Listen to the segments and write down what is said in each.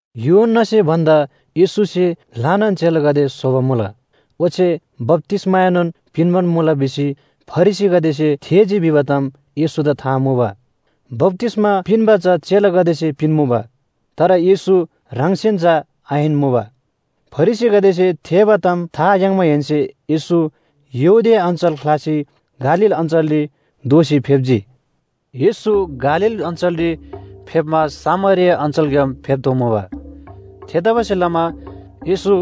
यूहन्‍नासे भन्‍दा येशूसे ल्‍हानान चेलागदे स्‍होबा मुला, ओच्‍छे बप्‍तिस्‍माएनोन पिन्‍बान मुला भिसी फरिसीगदेसे थेःजी भिबा ताम येशूदा था मुबा। बप्‍तिस्‍मा पिन्‍बा चा चेलागदेसे पिन्‍मुबा तर येशू ह्राङसेन चा आहिन मुबा। फरिसीगदेसे थेःबा ताम था याङ्माहेन्‍से येशू यहूदिया अञ्‍चल ख्‍लासी गालील अञ्‍चलरी दोःसी फेप्‍जी। येशू गालील अञ्‍चलरी फेप्‍मा सामरिया अञ्‍चलग्‍याम फेप्‍तोःमुबा। थेतबासेलमा येशू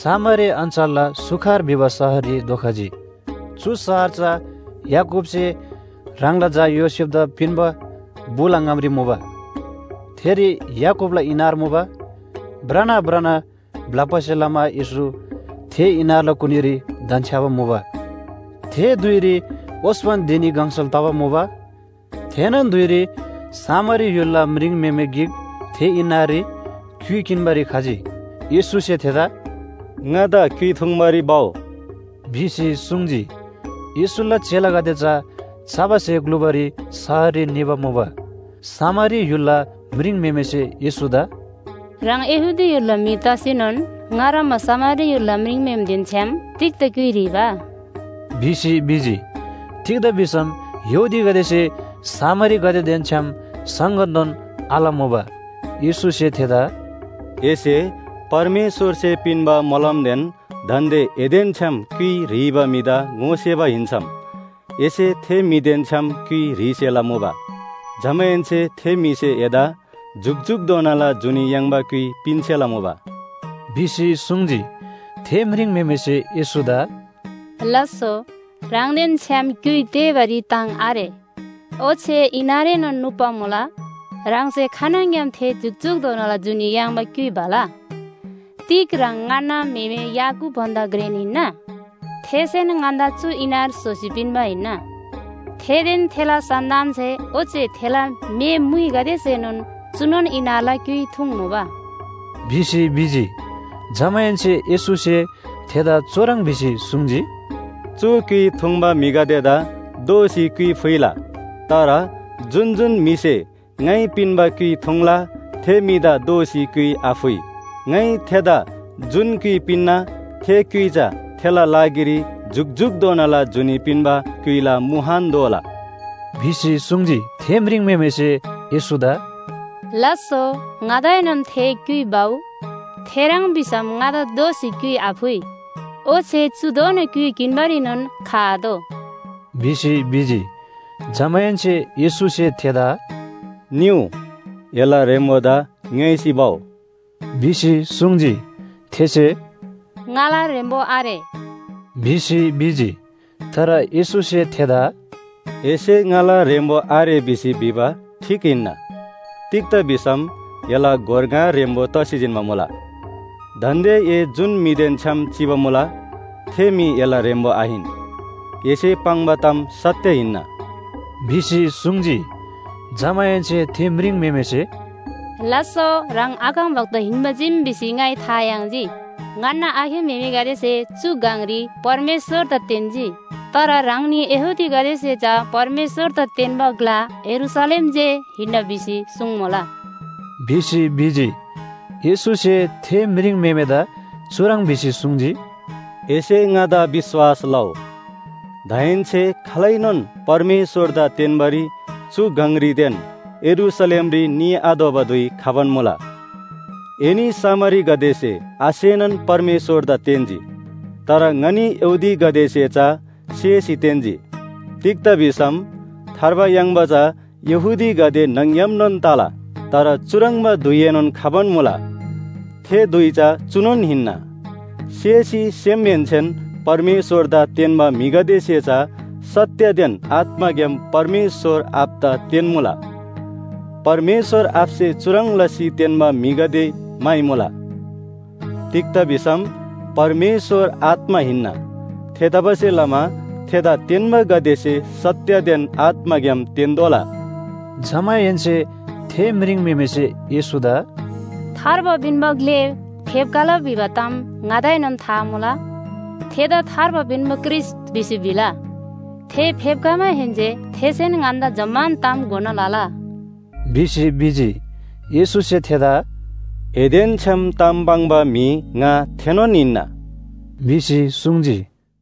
सामरिया अञ्‍चलला सुखार भिबा शहररी धोखजी। चु शहर चा याकूबसे ह्राङला झा योसेफदा पिन्‍बा बुला ङामरी मुबा। थेरी याकूबला इनार मुबा। भ्रना भ्रना ब्‍लप्‍बासे लमा येशू थे इनारला कुनीरी धन्‍छ्‌याबा मुबा। थे धुइरी ओस्‍पन धिनी गङसल तबा मुबा। थेनोन धुइरी सामरी य्‍हुलला म्रिङम्‍हेमे गिक थे इनाररी क्‍युइ किन्‍बारी खजी। येशूसे थेदा “ङादा क्‍युइ थुङ्बारी भउ” भिसी सुङ्जी। येशूला चेलागदे चा चबा स्‍हे ग्‍लुबारी शहररी निबा मुबा। सामरी य्‍हुलला म्रिङम्‍हेमेसे येशूदा “ह्राङ यहूदी य्‍हुलला म्‍हि तसीनोन ङा ह्रङ्‌बा सामरी य्‍हुलला म्रिङम्‍हेमेदेन छ्‌याम तिग्‍दा क्‍युइ ह्रीबा?” भिसी भिजी। तिग्‍दा भिसम यहूदीगदेसे सामरीगदेदेन छ्‌याम संगतनोन आलमुबा। येशूसे थेदा “एसे परमेश्‍वरसे पिन्‍बा मोलमदेन दान्‍दे एदेन छ्‌याम क्‍युइ ह्रीबा म्‍हिदा ङोसेबा हिन्‍सम एसे थे म्‍हिदेन छ्‌याम क्‍युइ ह्रीसेला मुबा। जमाहेन्‍से थे म्‍हिसे एदा जुकजुकधोनाला जुनी याङ्बा क्‍युइ पिन्‍सेला मुबा” भिसी सुङ्जी। थे म्रिङम्‍हेमेसे येशूदा “लास्‍सो, ह्राङदेन छ्‌याम क्‍युइ तेःबारी ताङ आरे, ओच्‍छे इनारएनोन नुप्‍बा मुला। ह्राङसे खानङग्‍याम थे जुकजुकधोनाला जुनी याङ्बा क्‍युइ भला? तिग ह्राङ ङन्‍ना म्‍हेमे याकूब भन्‍दा घ्रेन हिन्‍ना? थेसेन ङन्‍दा चु इनार स्‍होसी पिन्‍बा हिन्‍ना। थेदेन थेला सन्‍तानसे ओच्‍छे थेला म्‍हे मुइगदेसेनोन चुनोन इनारला क्‍युइ थुङ्मुबा” भिसी भिजी। जमाहेन्‍से येशूसे थेदा चुह्रङ् भिसी सुङ्जी, “चु क्‍युइ थुङ्बा म्‍हिगदेदा दोःसी क्‍युइ फुइला। तर जुन जुन म्‍हिसे ङाइ पिन्‍बा क्‍युइ थुङ्ला थे म्‍हिदा दोःसी क्‍युइ आफुइ। ङाइ थेदा जुन क्‍युइ पिन्‍ना, थे क्‍युइ चा थेला लागिरी जुकजुकधोनाला जुनी पिन्‍बा क्‍युइला मुहान दोला!” भिसी सुङ्जी। थे म्रिङम्‍हेमेसे येशूदा “लास्‍सो, ङादाएनोन थे क्‍युइ भउ, थेह्रङ् भिसम ङादा दोःसी क्‍युइ आफुइ ओच्‍छे चुधोना क्‍युइ किन्‍बारीनोन खआतोः” भिसी भिजी। जमाहेन्‍से येशूसे थेदा “निउ, एला ह्रेम्‍बोदा ङ्‌योइसी भउ” भिसी सुङ्जी। थेसे “ङाला ह्रेम्‍बो आरे” भिसी भिजी। तर येशूसे थेदा “एसे ङाला ह्रेम्‍बो आरे भिसी भिबा ठीक हिन्‍ना। तिग्‍दा भिसम एला गोर ङा ह्रेम्‍बो तसी जिन्‍बा मुला। दान्‍दे ए जुन म्‍हिदेन छ्‌याम चिबा मुला, थे म्‍हि एला ह्रेम्‍बो आहिन। एसे पाङ्बा ताम सत्‍य हिन्‍ना” भिसी सुङ्जी। जमाहेन्‍से थे म्रिङम्‍हेमेसे, “लास्‍सो, ह्राङ अगमवक्ता हिन्‍बा चीम भिसी ङाइ था याङ्जी। ङन्‍ना आखे म्‍हेमेगदेसे चु गङरी परमेश्‍वरदा तेन्‍जी, तर ह्राङनी यहूदीगदेसे चा परमेश्‍वरदा तेन्‍बा ग्‍ला यरूशलेम जे हिन्‍ना भिसी सुङ्मुला” भिसी भिजी। येशूसे थे म्रिङम्‍हेमेदा चुह्रङ् भिसी सुङ्जी, “एसे ङादा विश्‍वास लउ, दाहेन्‍से खालैनोन परमेश्‍वरदा तेन्‍बारी चु गङरीदेन यरूशलेमरी निआतोःबा धुइ खबान मुला। एनी सामरीगदेसे आसेनान परमेश्‍वरदा तेन्‍जी, तर ङनी यहूदीगदेसे चा सेसी तेन्‍जी। तिग्‍दा भिसम थार्बा याङ्बा चा यहूदीगदे न्‍हङ‌ग्‍यामनोन तला। तर चुह्रङ्बा धुइएनोन खबान मुला, थे धुइ चा चुनोन हिन्‍ना, सेसी सेमहेन्‍सेन परमेश्‍वरदा तेन्‍बा म्‍हिगदेसे चा सत्‍यदेन आत्‍माग्‍याम परमेश्‍वर आबादा तेन्‍मुला। परमेश्‍वर आबासे चुह्रङ् लसी तेन्‍बा म्‍हिगदे म्‍हाइमुला। तिग्‍दा भिसम परमेश्‍वर आत्‍मा हिन्‍ना। थेतबासेलमा थेदा तेन्‍बागदेसे सत्‍यदेन आत्‍माग्‍याम तेन्‍तोःला।” जमाहेन्‍से थे म्रिङम्‍हेमेसे येशूदा “थार्बा पिन्‍बा ग्‍ले फेप्‍खला भिबा ताम ङादाएनोन था मुला, थेदा ‘थार्बा पिन्‍बा ख्रीष्‍ट’ भिसी भिला। थे फेप्‍खमाहेन्‍से थेसेन ङन्‍दा जम्‍मान ताम घोना लला” भिसी भिजी। येशूसे थेदा “एदेन छ्‌याम ताम पाङ्बा म्‍हि, ङा थेनोन हिन्‍ना” भिसी सुङ्जी।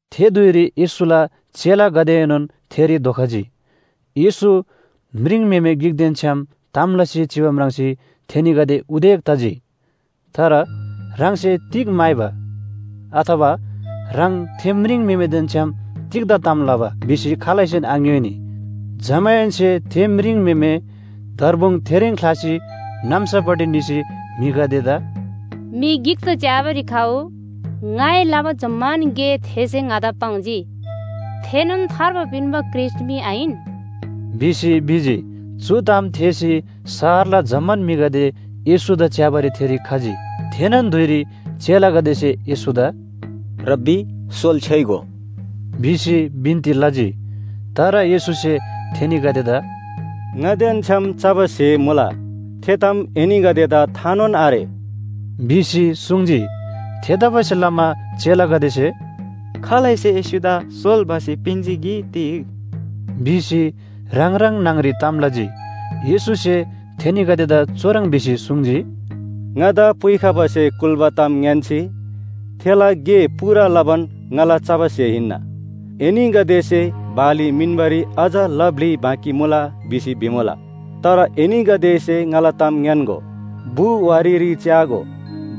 थे धुइरी येशूला चेलागदेएनोन थेरी धोखजी। येशू म्रिङम्‍हेमे गिकदेन छ्‌याम ताम लसी चिबा म्राङ्सी थेनीगदे उदेक तजी। तर “ह्राङसे तिग म्‍हाइबा?” अथवा “ह्राङ थे म्रिङम्‍हेमेदेन छ्‌याम तिग्‍दा ताम लबा” भिसी खालैसेन आङ्‍योइनी। जमाहेन्‍से थे म्रिङम्‍हेमे दर्बुङ थेरीन ख्‍लासी नाम्‍सापट्टि निसी म्‍हिगदेदा, “म्‍हि गिकदा च्‍याबारी खउ, ङाइ लबा जम्‍मान गे थेसे ङादा पाङ्जी। थेनोन थार्बा पिन्‍बा ख्रीष्‍ट मी आहिन?” भिसी भिजी। चु ताम थेःसी शहरला जम्‍मान म्‍हिगदे येशूदा च्‍याबारी थेरी खजी। थेनोन धुइरी चेलागदेसे येशूदा “रब्‍बी, सोल छ्‍योइगो” भिसी बिन्‍ती लजी। तर येशूसे थेनीगदेदा “ङादेन छ्‌याम चबा स्‍हे मुला, थे ताम एनीगदेदा थानोन आरे” भिसी सुङ्जी। थेतबासेलमा चेलागदेसे “खालैसे येशूदा सोल भसी पिन्‍जी कि तिग?” भिसी ह्राङ ह्राङ न्‍हङ‍री ताम लजी। येशूसे थेनीगदेदा चुह्रङ् भिसी सुङ्जी, “ङादा पुइखबासे कुल्‍बा ताम ङ्‌यान्‍सी थेला गे पूरा लबान ङाला चबा स्‍हे हिन्‍ना। एनीगदेसे ‘बाली मिन्‍बारी अझ ला ब्‍लि बाँकी मुला भिसी भिमुला।’ तर एनीगदेसे ङाला ताम ङ्‌यान्‍गो, बु वारीरी च्‍यागो,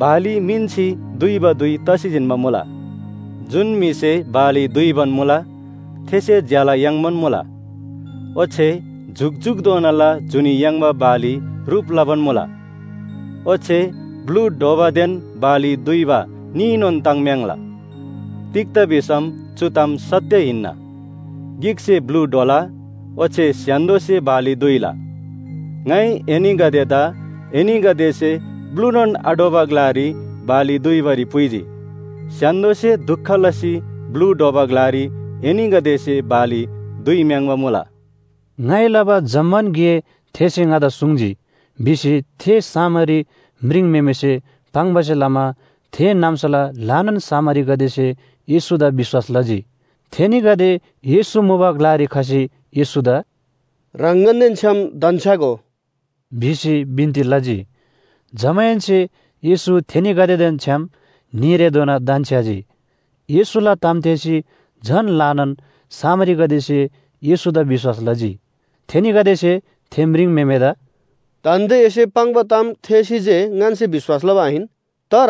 बाली मिन्‍सी दुइबा धुइ तसी जिन्‍बा मुला। जुन म्‍हिसे बाली दुइबान मुला, थेसे ज्‍यला याङ्बान मुला। ओच्‍छे जुकजुकधोनाला जुनी याङ्बा बाली ह्रुप लबान मुला। ओच्‍छे ब्‍लु ढ्‍वबादेन बाली दुइबा न्‍हीनोन ताङ्म्‍याङ्ला। तिग्‍दा भिसम चु ताम सत्‍य हिन्‍ना। ‘गिकसे ब्‍लु ढ्वला, ओच्‍छे स्‍य्‍हान्‍दोसे बाली दुइला।’ ङाइ एनीगदेदा एनीगदेसे ब्‍लुनोन आढ्‍वबा ग्‍लारी बाली दुइबारी पुइजी। स्‍य्‍हान्‍दोसे दुख लसी ब्‍लु ढ्वबा ग्‍लारी एनीगदेसे बाली दुइम्‍याङ्बा मुला।” “ङाइ लबा जम्‍मान गे थेसे ङादा सुङ्जी” भिसी थे सामरी म्रिङम्‍हेमेसे पाङ्बासे लमा थे नाम्‍साला ल्‍हानान सामरीगदेसे येशूदा विश्‍वास लजी। थेनीगदे येशू मुबा ग्‍लारी खसी येशूदा “ह्राङ ङन्‍देन छ्‌याम धन्‍छ्‌यागो” भिसी बिन्‍ती लजी। जमाहेन्‍से येशू थेनीगदेदेन छ्‌याम न्‍हीरेधोना धन्‍छ्‌याजी। येशूला ताम थेःसी झन ल्‍हानान सामरीगदेसे येशूदा विश्‍वास लजी। थेनीगदेसे थे म्रिङम्‍हेमेदा “दान्‍दे एसे पाङ्बा ताम थेःसी जे ङन्‍से विश्‍वास लबा आहिन, तर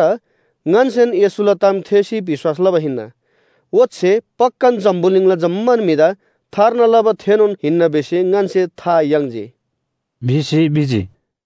ङन्‍सेन येशूला ताम थेःसी विश्‍वास लबा हिन्‍ना। ओच्‍छे पक्‍कान जम्‍बुलिङला जम्‍मान म्‍हिदा थार्ना लबा थेनोन हिन्‍ना भिसी ङन्‍से था याङ्जी” भिसी भिजी।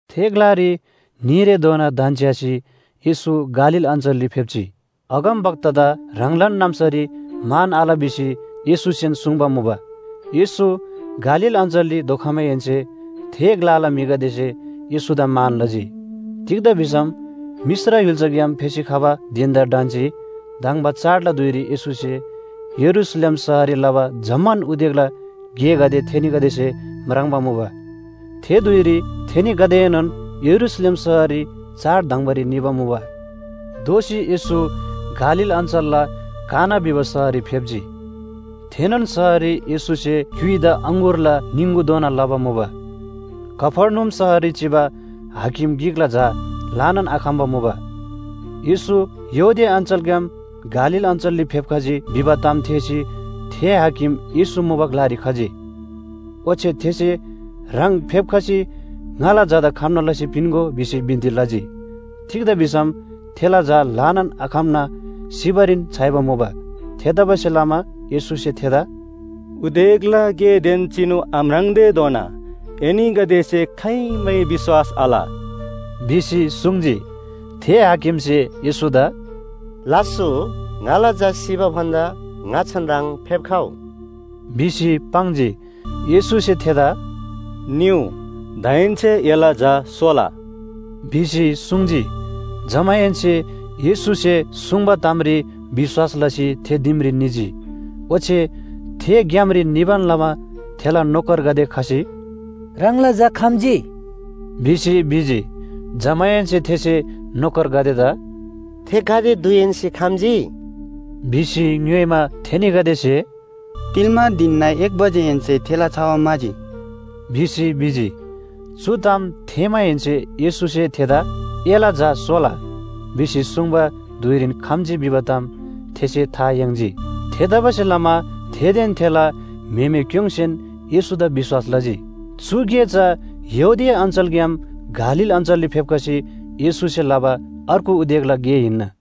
थे ग्‍लारी न्‍हीरेधोना धन्‍छ्‌यासी येशू गालील अञ्‍चलरी फेप्‍जी। अगमवक्तादा ह्राङलान नाम्‍सारी मान आल भिसी येशूसेन सुङ्बा मुबा। येशू गालील अञ्‍चलरी धोखमाहेन्‍से थे ग्‍लाला म्‍हिगदेसे येशूदा मान लजी। तिग्‍दा भिसम मिश्र य्‍हुल्‍साग्‍याम फेसी खबा धिन‍दा ढन्‍सी धङ्बा चाडला धुइरी येशूसे यरूशलेम शहररी लबा जम्‍मान उदेकला गेगदे थेनीगदेसे म्राङ्बा मुबा। थे धुइरी थेनीगदेएनोन यरूशलेम शहररी चाड धङ्‍बारी निबा मुबा। दोःसी येशू गालील अञ्‍चलला काना भिबा शहररी फेप्‍जी। थेनोन शहररी येशूसे क्‍युइदा अङगुरला निङगु दोना लबा मुबा। कफर्नहुम शहररी चिबा हाकिम गिकला झा ल्‍हानान आखम्‍बा मुबा। येशू यहूदिया अञ्‍चलग्‍याम गालील अञ्‍चलरी फेप्‍खजी भिबा ताम थेःसी थे हाकिम येशू मुबा ग्‍लारी खजी। ओच्‍छे थेसे ह्राङ फेप्‍खसी ङाला झादा खम्‍ना लसी पिन्‍गो भिसी बिन्‍ती लजी। तिग्‍दा भिसम थेला झा ल्‍हानान आखम्‍ना सिबारीन छ्‌याइबा मुबा। थेतबासेलमा येशूसे थेदा “उदेकला गेदेन चिनु आम्राङ्तेधोना एनीगदेसे खाइमै विश्‍वास आल” भिसी सुङ्जी। थे हाकिमसे येशूदा “लास्‍सो, ङाला झा सिबा भन्‍दा ङाच्‍छान ह्राङ फेप्‍खउ” भिसी पाङ्जी। येशूसे थेदा “निउ, दाहेन्‍से एला झा सोला” भिसी सुङ्जी। जमाहेन्‍से येशूसे सुङ्बा तामरी विश्‍वास लसी थे दिमरी निजी। ओच्‍छे थे ग्‍यामरी निबान लमा थेला नोकरगदे खसी, “ह्राङला झा खम्‍जी” भिसी भिजी। जमाहेन्‍से थेसे नोकरगदेदा “थे गाते धुइहेन्‍से खम्‍जी?” भिसी ङ्‌योइमा, थेनीगदेसे “तिल्‍मा धिनना एक बजेहेन्‍से थेला छवा म्‍हाजी” भिसी भिजी। चु ताम थेःमाहेन्‍से येशूसे थेदा “एला झा सोला” भिसी सुङ्बा धुइरीन खम्‍जी भिबा ताम थेसे था याङ्जी। थेतबासेलमा थेदेन थेला म्‍हेमेक्‍योङ्सेन येशूदा विश्‍वास लजी। चु गे चा यहूदिया अञ्‍चलग्‍याम गालील अञ्‍चलरी फेप्‍खसी येशूसे लबा अर्गु उदेकला गे हिन्‍ना।